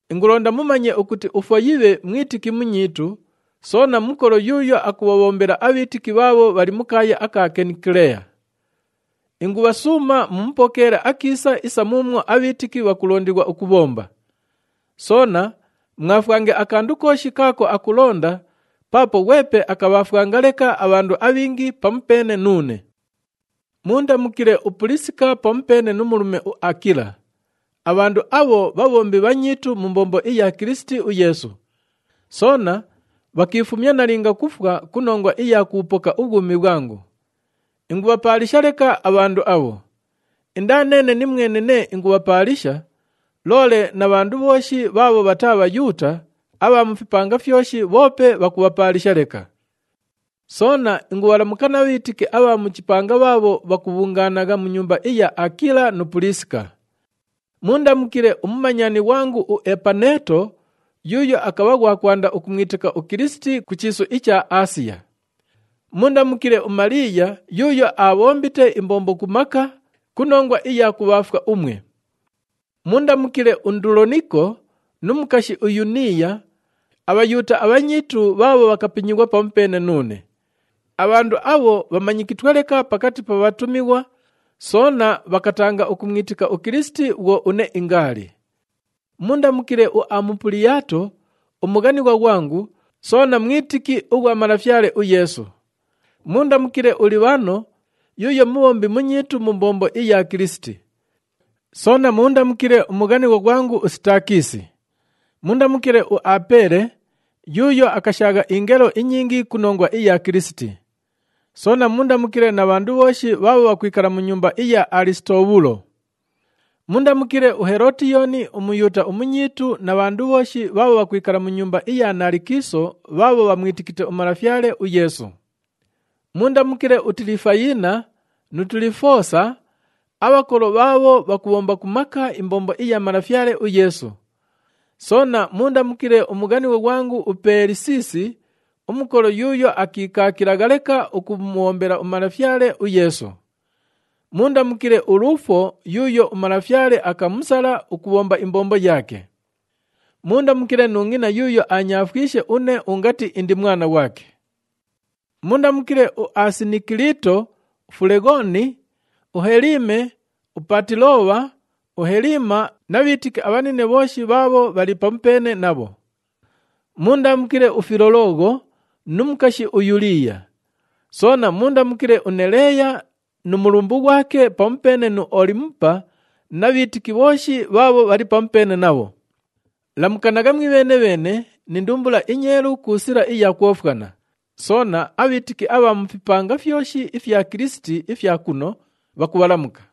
Ingulonda mumanye ukuti uFoyibhe mwitiki munyiitu, soona mukolo yuuyo akubhabhombela abhiitiki bhaabho bhali mu kaaya aka Kenikeleya. Ingubhasuuma mumupokeele akiisa isa muumwo abhiitiki bhakulondighwa ukubhomba. Soona mwafwange akandu kooshi kaako akulonda paapo ghwepe akabhaafwanga leka abhandu abhingi pamupeene nuune. Muundamukile uPuliisika pamupeene nu mulume uAakila. Abhandu abho bhabhombi bhanyiitu mu mbombo iya Kilisiti uYeesu. Soona bhakiifumya nalinga kufwa ku nongwa iya kubhupoka ubhwumi bhwangu. Ingubhapaalisha leka abhandu abho. Indaa neene nimwene nee ingubhapaalisha, loole na bhandu bhooshi bhaabho bhataa Bhayuuta abha mu fipanga fyoshi bhoope bhakubhapaalisha leka. Soona ingubhalamuka na bhiitiki abha mu chipanga bhaabho bhakubhungaanagha mu nyumba iya Aakila nu Puliisika. Muundamukile umumanyani ghwangu uEpaneeto yuuyo akabha ghwa kwanda ukumwitika uKilisiti ku chiisu icha Aasiya. Muundamukile uMaliiya yuuyo aabhombite imbombo ku maka ku nongwa iya kubhaafwa umwe. Muundamukile uNduloniko nu mukashi uYuniiya, aBhayuuta abhanyiitu bhaabho bhakapinyighwa pamupeene nuune. Abhandu abho bhamanyikitwe leka pakati pa bhatumighwa, soona bhakatanga ukumwitika uKilisiti bhwo une ingaali. Muundamukile uAmupuliyaato umughanighwa ghwangu soona mwitiki ughwa Malafyale uYeesu. Muundamukile uLibhano yuuyo mubhombi munyiitu mu mbombo iya Kilisiti. Soona muundamukile umughanighwa ghwangu uSitaakisi. Muundamukile uApeele, yuuyo akashaagha ingelo inyingi ku nongwa iya Kilisiti. Soona muundamukile na bhandu bhooshi bhaabho bhakwikala mu nyumba iya Alisitobhulo. Muundamukile uHelootiyooni uMuyuuta umunyiitu na bhandu bhooshi bhaabho bhakwikala mu nyumba iya Naalikiiso bhaabho bhamwitikite uMalafyale uYeesu. Muundamukile uTilifayina nu Tilifoosa, abhakolo bhaabho bhakubhomba ku maka imbombo iya Malafyale uYeesu. Soona muundamukile umughanighwa ghwangu uPeelisisi, umukolo yuuyo akiikaakilagha leka ukumubhombela uMalafyale uYeesu. Muundamukile uLuufo yuuyo uMalafyale akamusala ukubhomba imbombo yaake. Muundamukile nu ngʼina yuuyo aanyaafwishe une ungati indi mwana ghwake. Muundamukile uAsinikilito, uFuleghooni, uHelime, uPaatilobha, uHelima na bhiitiki abhanine bhooshi bhaabho bhali pamupeene nabho. Muundamukile uFilologho nu mukashi uYuliiya. Soona muundamukile uNeleeya nu mulumbu ghwake pamupeene nu Olimupa na bhiitiki bhooshi bhaabho bhali pamupeene nabho. Lamukanagha mwibheene-bheene ni ndumbula inyeelu ku sila iya kwofwana. Soona, abhiitiki abha mu fipanga fyoshi ifya Kilisiti ifya kuno, bhakubhalamuka.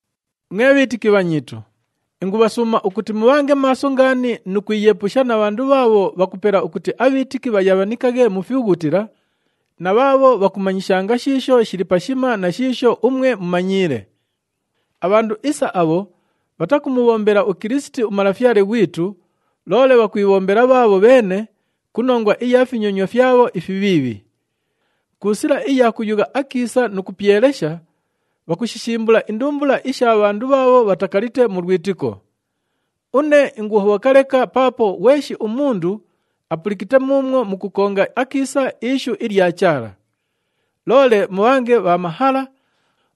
Mwe bhiitiki bhanyiitu, ingubhasuuma ukuti mubhange maaso ngaani nu kwiyeepusha na bhandu bhaabho bhakupela ukuti abhiitiki bhayabhanikaghe mu fibhughutila, na bhaabho bhakumanyishanga shiisho shili pashima na shiisho umwe mumanyiile. Abhandu isa abho bhatakumubhombela uKilisiti uMalafyale ghwitu, loole bhakwibhombela bhaabho bheene ku nongwa iya finyonywa fyabho ifibhiibhi. Ku sila iya kuyugha akiisa nu kupyelesha, bhakushishimbula indumbula isha bhandu bhaabho bhatakalite mu lwitiko. Une inguhobhoka leka paapo ghweshi umundu apulikite muumwo mukukonga akiisa ishu ilya Chaala. Loole mubhange bha mahala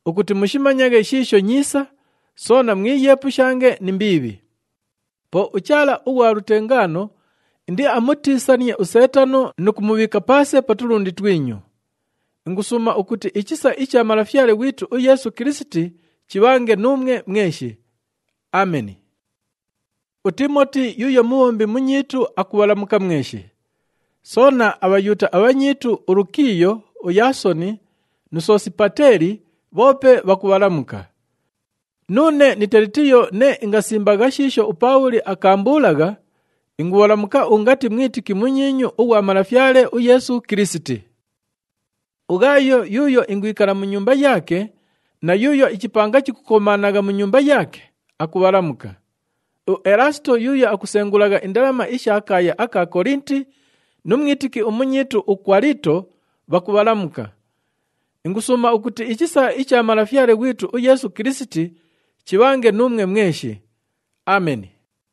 ukuti mushimanyaghe shiisho nyiisa, soona mwiyeepushange ni mbiibhi. Po uChaala ughwa lutengaano indiamutiisanie uSeetano nu kumubhiika paase pa tulundi twinyu. Ingusuuma ukuti ichisa icha Malafyale ghwitu uYeesu Kilisiti chibhange nuumwe mweshi. [Ameni.] UTiimoti yuuyo mubhombi munyiitu akubhalamuka mweshi. Soona, aBhayuuta abhanyiitu uLukiiyo, uYaasoni nu Sosipateeli bhoope bhakubhalamuka. Nuune ni Telitiyo nee ingasimbagha shiisho uPaabhuli akaambuulagha, ingubhalamuka ungati mwitiki munyiinyu ughwa Malafyale uYeesu Kilisiti. UGhaayo yuuyo ingwikala mu nyumba yaake na yuuyo ichipanga chikukomaanagha mu nyumba yaake, akubhalamuka. UElaasito yuuyo akusengulagha indalama isha kaaya aka Kolinti nu mwitiki umunyiitu uKwalito, bhakubhalamuka. [ Ingusuuma ukuti ichisa icha Malafyale ghwitu uYeesu Kilisiti chibhange nuumwe mweshi. Ameni.]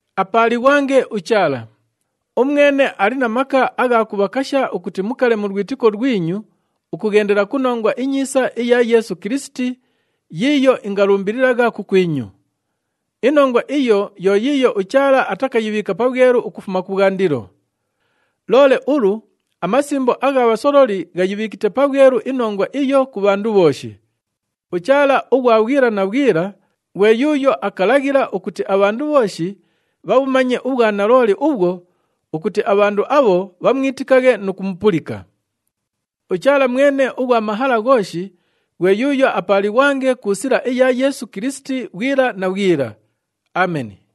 Apaalighwange uChaala! Umwene ali na maka agha kubhakasha ukuti mukale mu lwitiko lwinyu ukughendela ku Nongwa iNyiisa iya Yeesu Kilisiti yiiyo ingalumbililagha kukwinyu. Inongwa iyo yo yiiyo uChaala atakayibhiika pabhwelu ukufuma kubhwandilo. Loole ulu amasimbo agha bhasololi ghayibhiikite pabhwelu inongwa iyo ku bhandu bhooshi. UChaala ughwa bhwila na bhwila ghwe yuuyo akalaghila ukuti abhandu bhooshi bhabhumanye ubhwanalooli ubhwo ukuti abhandu abho bhamwitikaghe nu kumupulika. UChaala mwene ughwa mahala ghooshi ghwe yuuyo apaalighwange ku sila iya Yeesu Kilisiti bhwila na bhwila. Ameni.